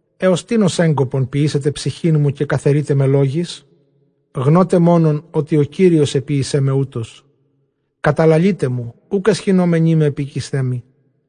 Ἕως τίνος ἔγκοπον ποιήσετε ψυχήν μου, καὶ καθαιρεῖτέ με λόγοις; γνῶτε μόνον ὅτι ὁ Κύριος ἐποίησέ με οὕτως. Καταλαλεῖτέ μου, οὐκ αἰσχυνόμενοί με ἐπίκεισθέ μοι.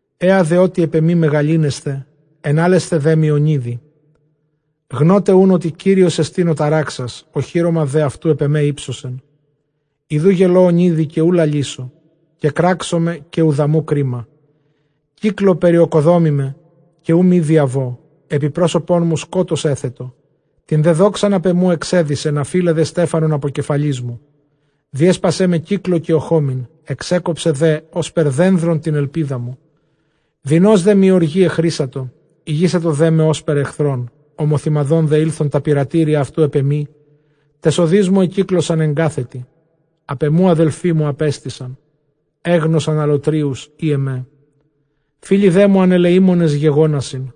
Ἔα δὲ, ὅτι ἐπʼ ἐμοὶ μεγαλύνεσθε, ἐνάλλεσθε δέ μοι ὀνείδει. Γνῶτε οὖν ὅτι Κύριός ἐστιν ὁ ταράξας, ὀχύρωμα δὲ αὐτοῦ ἐπʼ ἐμὲ ὕψωσεν. Ἰδοὺ γελῶ ὀνείδει, οὐ λαλήσω· κεκράξομαι, καὶ οὐδαμοῦ κρίμα. Κύκλῳ περιῳκοδόμημαι, καὶ οὐ μὴ διαβῶ· ἐπὶ πρόσωπόν μου σκότος ἔθετο. Τὴν δὲ δόξαν ἀπʼ ἐμοῦ ἐξέδυσεν, ἀφεῖλε δὲ στέφανον ἀπὸ κεφαλῆς μου. Διέσπασέ με κύκλῳ καὶ ᾠχόμην, ἐξέκοψε δὲ ὥσπερ δένδρον τὴν ἐλπίδα μου. Δεινῶς δέ μοι ὀργῇ ἐχρήσατο, ἡγήσατο δέ με ὥσπερ ἐχθρόν. Ὁμοθυμαδὸν δὲ ἦλθον τὰ πειρατήρια αὐτοῦ ἐπʼ ἐμοὶ, ταῖς ὁδοῖς μου ἐκύκλωσαν ἐγκάθετοι. Ἀπʼ ἐμοῦ ἀδελφοί μου ἀπέστησαν, ἔγνωσαν ἀλλοτρίους ἢ ἐμέ· φίλοι δέ μου ἀνελεήμονες γεγόνασιν·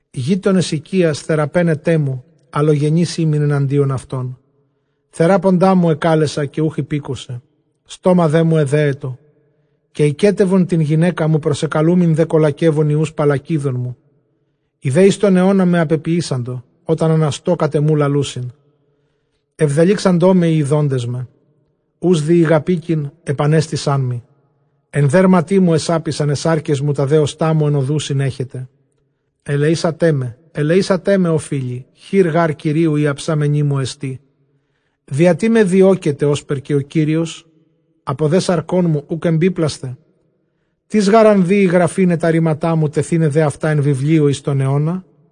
Γείτονες οἰκίας, θεράπαιναί τε μοῦ, ἀλλογενὴς ἤμην ἐναντίον αὐτῶν. Θεράποντά μου ἐκάλεσα, καὶ οὐχ ὑπήκουσε· στόμα δέ μου ἐδέετο. Καὶ ἱκέτευον τὴν γυναῖκά μου, προσεκαλούμην δὲ καλακευων υἱοὺς παλλακίδων μου· Οἱ δὲ εἰς τὸν αἰῶνά με ἀπεποιήσαντο, ὅταν ἀναστῶ, κατʼ ἐμοῦ λαλοῦσιν. Ἐβδελύξαντό με οἱ ἰδόντες με· οὓς δὴ ἠγαπήκειν, ἐπανέστησάν μοι. Ἐν δέρματί μου ἐσάπησαν αἱ σάρκες μου, τὰ δὲ ὀστᾶ μου ἐν ὀδοῦσιν ἔχεται. Ἐλεήσατέ με, ἐλεήσατέ με, ὦ φίλοι, χεὶρ γὰρ Κυρίου ἡ ἁψαμένη μου ἐστί. Διατί με διώκετε ὥσπερ καὶ ὁ Κύριος; ἀπὸ δὲ σαρκῶν μου οὐκ ἐμπίπλασθε; Τίς γὰρ ἂν δοίη γραφῆναι τὰ ῥήματά μου, τεθῆναι δὲ αὐτὰ ἐν βιβλίῳ εἰς τὸν αἰῶνα,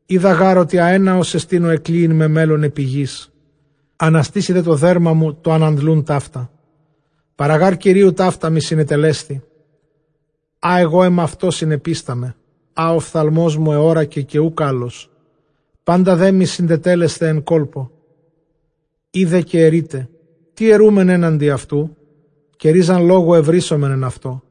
Οἶδα γὰρ ὅτι ἀένναός ἐστιν ὁ ἐκλύειν με μέλλων, ἐπὶ γῆς ἀναστῆσαι τὸ δέρμα μου τὸ ἀναντλοῦν ταῦτα· παρὰ γὰρ Κυρίου ταῦτά μοι συνετελέσθη, ἃ ἐγὼ ἐμαυτῷ συνεπίσταμαι, ἃ ὁ ὀφθαλμός μου ἑώρακε, καὶ οὐκ ἄλλος, πάντα δέ μοι συντετέλεσται ἐν κόλπῳ. Εἰ δὲ καὶ ἐρεῖτε, τί ἐροῦμεν ἔναντι αὐτοῦ, καὶ ῥίζαν λόγου εὑρήσομεν ἐν αὐτῷ;